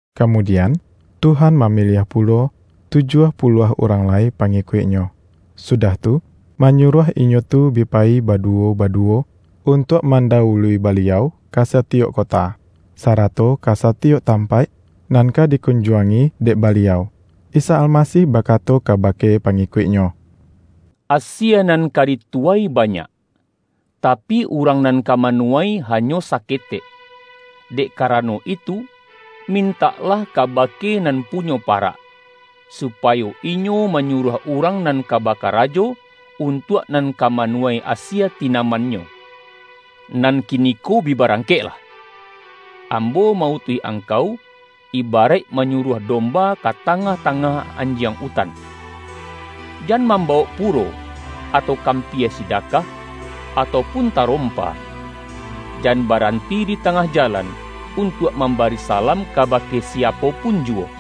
Kamudian, Tuhan mamiliah pulo tujuah puluah urang lai pangikuik-Nyo, sudah tu, manyuruah inyo tu bi payi baduwo-baduwo, un-tuak mandawului Baliau ka satiyok ko-ta, sarato ka satiyok tampaik nan ka dikunjuangi dek Baliau. Isa Almasih bakato kabake pangikuik-Nyo,”Asie nan ka dituwai banyak, tapi, urang nan ka manuwai hanyo saketek. Dek kara-no itu, mintaklah kabake Nan Punyo parak, supayo Inyo manyuruah urang nan ka bakarajo, untuak nan ka manu-wai asie tinaman-Nyo. Nan kiniko bi barangkeklah! Ambo ma-utuih angkau, ibaraik manyuruah domba ka tangah-tangah anjiang utan. Jan mambawok puro, atau kampia sidakah, atau pun tarompa. Jan baranti di tangah jalan, untuak mambari salam kabake siapo pun juwo.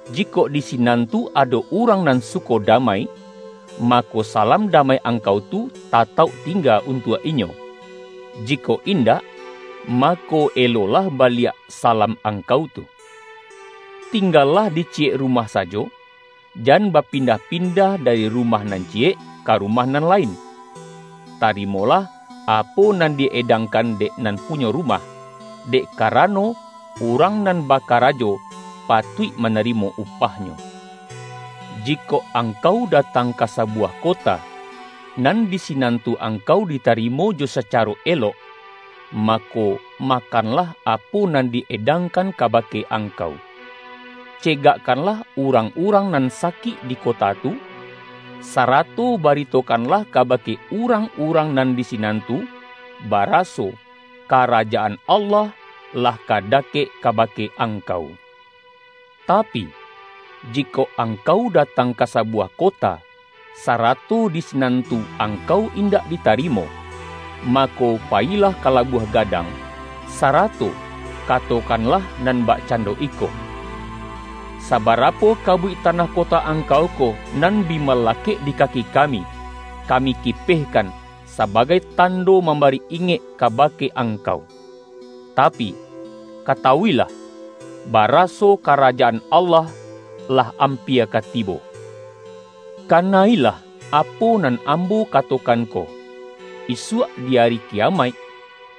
Jikok di sinan tu ado urang nan suko damai, mako, salam damai angkau tu tatauk tingga untuak inyo; jikok indak, mako elolah baliak salam angkau tu. Tinggalah di ciyek rumah sajo. Jan bapindah-pin-dah dari rumah nan ciyek, ka rumah nan lain. Tarimolah apo nan di-edang-kan dek nan punyo rumah, dek kara-no, urang nan bakarajo patuik manari-mo upahnyo. Jikok angkau datang ka sabuwah kota, nan di sinan tu angkau ditarimo jo sacaro elok, mako, makan-lah apo nan di-edangkan kabake ang-kau. Cegakkanlah urang-urang nan sakik di kota tu, sarato baritokanlah kabake urang-urang nan di sinan tu, baraso, ’ Karajaan Allah lah ka dakek kabake angkau.’ Tapi, jikok angkau datang ka sabuwah kota, sarato di si-nan tu angkau indak ditarimo, mako, payilah ka labuah gadang, sarato ka-tokanlah nan bakcando iko, ’Sabara-po kabuik tanah kota angkau ko, nan bi malakek di kaki kami, kami kipeh-kan, sabagai tando mambari ingek ka-bake angkau. Tapi, katawu-ilah, bara-so Karajaan Allah lah ampia ka tibo!' Kana-ilah apo nan Ambo katokan ko, isuak di Ari Kiyamaik,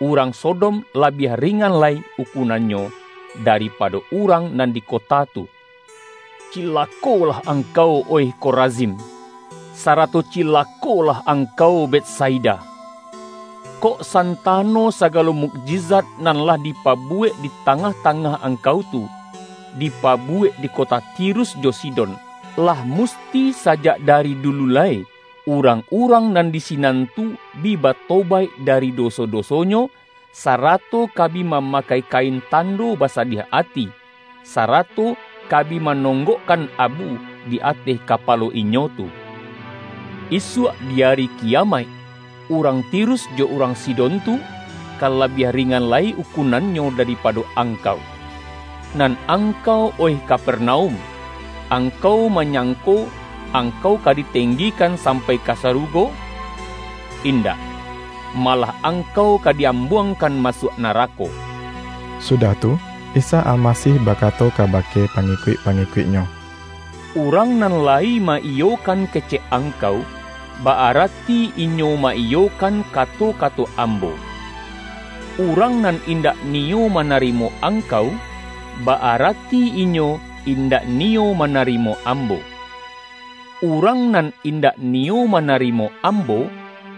urang So-dom labiah ringan lai ukunannyo, da-ripado urang nan di kota tu!” ”Cilakolah angkau, oih Korazim! Sa-rato cilakolah angkau, Betsaida! Kok san-tano sagalo mukjizat, nan lah dipabuwek di tangah-tangah angkau tu, dipabuwek di kota Tirus jo Sidon, lah musti sajak da-ri dulu lai, urang-urang nan di sinan tu bi batobaik dari doso-dosonyo, sarato ka bi mamakai kain tando basadiah ati, sarato ka bi manonggokkan abu, di ateh kapalo inyo tu. Isuak di Ari Kiyamaik, urang Tirus jo urang Sidon tu, ka labiah ringan lai ukunannyo daripado angkau. Nan angkau, oih Kapernaum! Angkau ma-nyangko, angkau ka ditenggikan sampai ka sarugo? Indak! Malah angkau ka di-ambuangkan masuak narako!” Sudah tu, Isa Almasih bakato kabake pangikuik-pangikuik-Nyo,”Urang nan lai ma-iyokan kecek angkau, ba-arati inyo ma-iyokan kato-kato Ambo. Urang nan indak niyo manarimo angkau, ba-arati inyo, indak niyo manarimo Ambo. Urang nan indak ni-yo manarimo Ambo,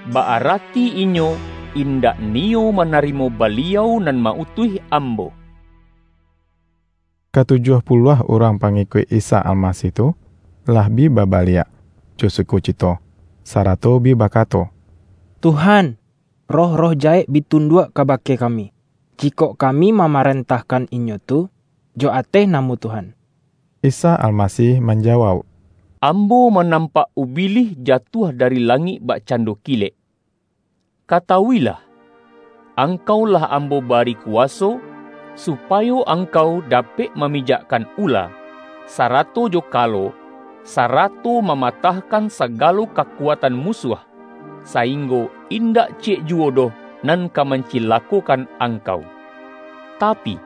ba-arati inyo, indak ni-yo manarimo Baliau nan ma-utuih Ambo.” Katujuah puluah urang pangikuik Isa Almasih tu, lah bi babaliak jo sukocito, sarato bi bakato:”Tuhan, roh-roh jahek bi tunduak kabake kami, ji-kok kami mamarentahkan inyo tu jo ateh namo Tuhan!” Isa Almasih manjawauk,”Ambo manampak Ubilih jatuah dari langik bakcando kilek. Katawu-ilah! Ang-kau lah Ambo bari kuwaso, supayo angkau dapek mamijakkan ula, sara-to jo kalo, sarato mamatahkan sagalo kakuatan musuah, sainggo indak ci-yek juwo doh nan ka mancilakokan angkau. Tapi,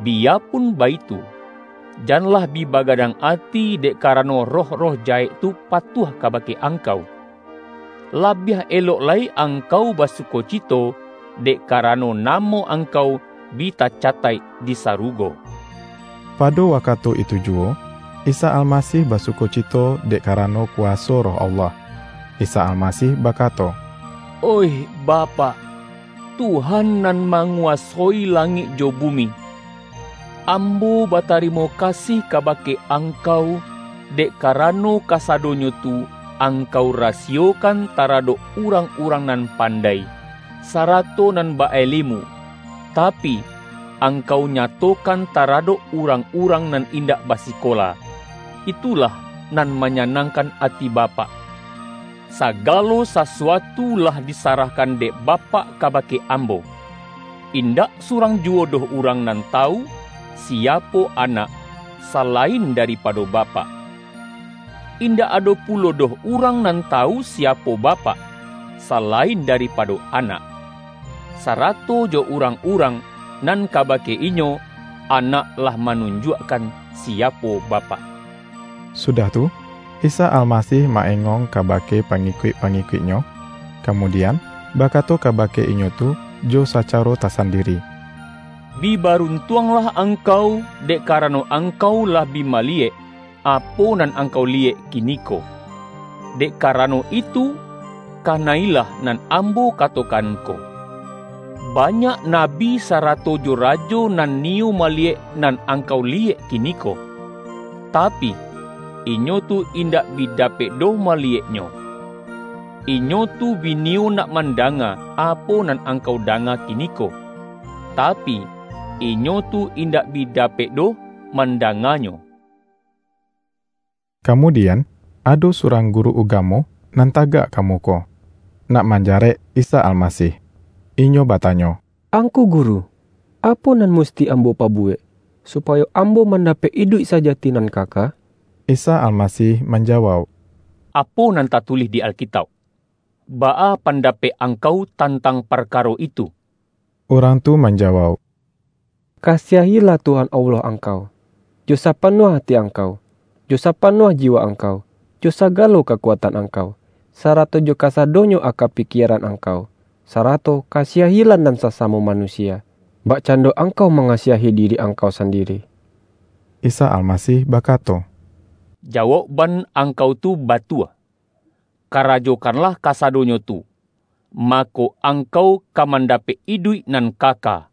biyapun baitu, jan-lah bi bagadang ati dek karano roh-roh jahek tu patuah kabake angkau. Labiah elok lai angkau basukocito, dek karano namo angkau bi tacataik di sarugo.” Pado wakatu itu juwo, Isa Almasih basukocito dek karano kuwaso Roh Allah. Isa Almasih bakato,”Oih Ba-pak, Tuhan nan manguwasoi langik jo bumi! Ambo batarimo kasih kabake Angkau, dek karano kasadonyo tu Ang-kau rasiyokan, taradok urang-urang nan pandai, sarato nan ba-alemu, ta-pi, Angkau nyatokan taradok urang-urang nan indak basikola. Itulah nan manyanangkan ati Bapak. Sagalo sasuatu lah disarahkan dek Bapak kabake Ambo. Indak surang ju-wo doh urang nan tawu, siapo Anak, salain daripado Bapak. Indak ado pulo doh urang nan tawu siapo Bapak, sa-lain daripado Anak; sarato jo urang-urang, nan kabake inyo, Anak lah ma-nunjuakkan, siapo Bapak.” Sudah tu, Isa Almasih ma-engong kabake pangikuik-pangikuik-Nyo, ka-mudian, bakato kabake inyo tu jo sa-caro tasandiri,”Bi baruntuanglah ang-kau, dek karano angkau lah bi maliyek, apo nan angkau liyek kiniko. Dek karano itu, kana-ilah nan Ambo katokan ko: Banyak nabi sarato jo rajo, nan niyo maliyek, nan angkau liyek kiniko, tapi, inyo tu indak bi dapek doh maliyeknyo. Inyo tu bi niyo nak mandanga, apo nan angkau danga ki-niko, tapi inyo tu indak bi dapek doh mandanganyo.” Kamudian, ado surang guru uga-mo nan tagak ka muko, nak manjarek Isa Almasih. Inyo batanyo,”Angku Guru, apo nan musti ambo pabuwek, supayo ambo mandapek iduik saja-ti nan kaka?” Isa Almasih manjawauk,”Apo nan tatulih di Alkitauk? Baa pandapek ang-kau tantang parkaro itu?” Urang tu manjawauk,”'Kasiah-ilah Tuhan Allah angkau, jo sapanuah ati angkau, jo sapanuah jiwa angkau, jo sagalo kakuatan angkau, sarato jo kasadonyo aka pikieran angkau,' sa-rato ’ Kasiah-ilah nan sasamo manu-sia, bakcando angkau mangasiahi di-ri angkau sandiri.’” Isa Almasih bakato,”Jawaukban angkau tu batua, karajokanlah kasa-donyo tu, mako, angkau ka manda-pek iduik nan kaka.”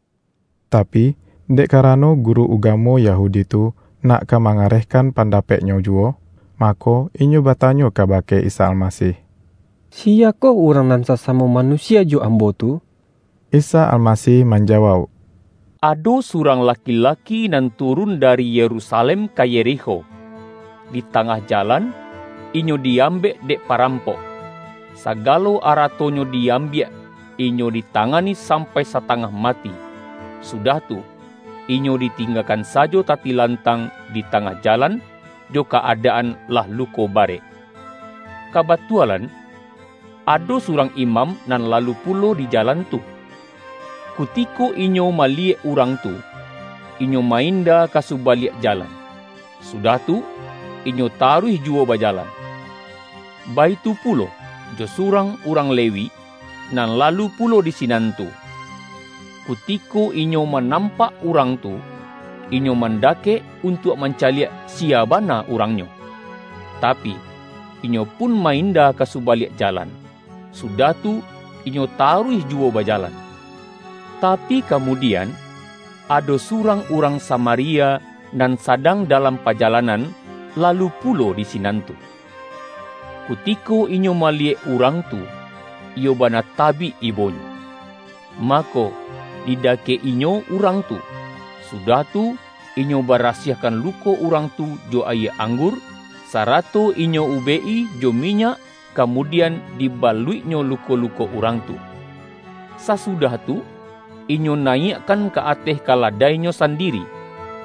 Tapi, dek karano guru ugamo Ya-hudi tu, nak ka mangarehkan panda-peknyo juwo. Mako, inyo batanyo ka-bake Isa Almasih,”Siyakoh urang nan sasamo manusia jo ambo tu?” Isa Almasih manjawauk,”Ado su-rang laki-laki nan turun dari Yerusa-lem ka Yerikho. Di tangah jalan, inyo di-ambek dek parampok, sagalo ara-tonyo di-ambiak, inyo ditangani sam-pai satangah mati, sudah tu, inyo di-tinggakan sajo tatilantang di tangah jalan, jo ka-adaan lah luko barek. Kabatualan, ado surang imam nan lalu pulo di jalan tu. Kutiko inyo ma-liyek urang tu, inyo ma-inda ka subaliak jalan, sudah tu, inyo taruih juwo bajalan. Baitu pulo, jo surang urang Lewi, nan lalu pulo di sinan tu; kutiko inyo manampak urang tu, inyo man-dakek untuak mancaliak siya bana urangnyo. Tapi, inyo pun ma-inda ka subaliak jalan, sudah tu, inyo taruih juwo bajalan. Tapi, kamudian, ado surang urang Samaria nan sadang da-lam pajalanan, lalu pulo di sinan tu. Kutiko inyo maliyek urang tu, iyo ba-na tabik ibonyo. Mako, didakek-inyo urang tu, sudah tu, inyo barasiahkan luko urang tu jo ayie anggur, sara-to inyo ubek-i jo minyak, kamudian, dibaluiknyo luko-luko urang tu. Sa-sudah tu, inyo nayiakkan ka ateh ka-ladainyo sandiri,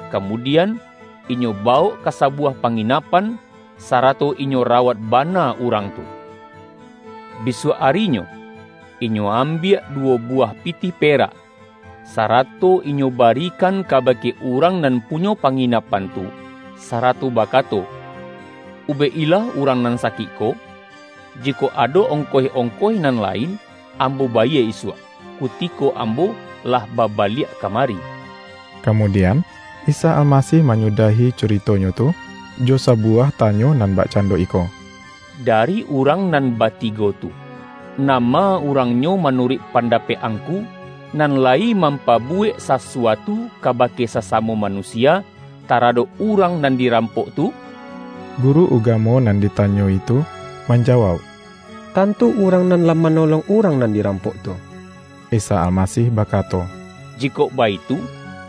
kamudian, inyo ba-wok ka sabuwah panginapan, sarato inyo rawat bana urang tu. Bisuak arinyo, inyo ambiak duwo buwah pi-tih perak, sarato inyo barikan kaba-ke urang nan punyo panginapan tu, sarato bakato, ’Ubek-ilah urang nan sakik ko, jikok ado ongkoih-ongkoih nan lain, ambo bayie isuak, kutiko ambo lah babaliak kamari.’” Kamudian, Isa Almasih manyu-dahi curito-Nyo tu, jo sabuwah tanyo nan bakcando iko,”Dari urang nan batigo tu, nama urangnyo manuruik pandapek angku, nan layi mampabu-wek sasuatu kabake sasamo manusia, taradok urang nan dirampok tu?” Guru ugamo nan ditanyo-i tu man-jawauk,”Tantu urang nan lah ma-nolong urang nan dirampok tu.” Isa Almasih bakato,”Jikok baitu,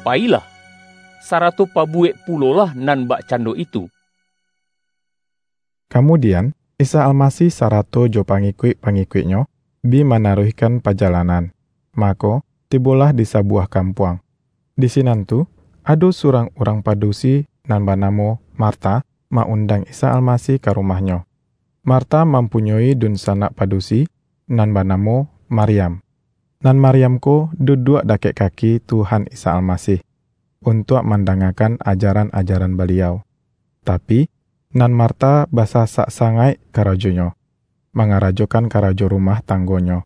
payi-lah, sarato pabuwek pulolah nan bak-cando itu!” Kamudian, Isa Almasih sarato jo pangikuik-pangikuik-Nyo, bi ma-naruihkan pajalanan, mako, tibolah di sabuwah kampuang. Di sinan tu, ado surang urang padusi nan banamo Marta, ma-undang Isa Almasih ka rumahnyo. Marta mampunyoi dunsanak padusi nan banamo Mar-yam. Nan Maryam ko, duduak da-kek kaki Tuhan Isa Almasih, untuak mandangakan ajaran-ajaran Baliau. Tapi, nan Marta basasak sangaik karajonyo, mangarajokan karajo ru-mah tanggonyo.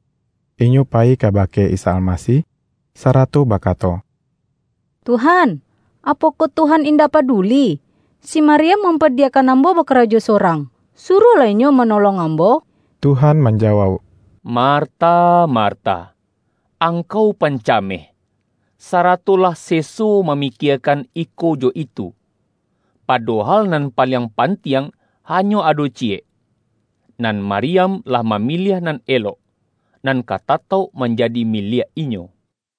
Inyo payi kabake Isa Almasih, sarato bakato,”Tuhan, apo-koh Tuhan indak paduli, si Maryam mampadiyakan ambo bakarajo sorang? Suruahlah inyo manolong ambo!” Tuhan manjawauk,”Marta, Mar-ta! Angkau pancameh, sarato lah seso mamikiekan iko jo itu; padohal, nan paliang pantiang, hanyo ado ciyek. Nan Maryam lah mamiliah nan elok, nan ka tatauk manjadi miliak inyo.”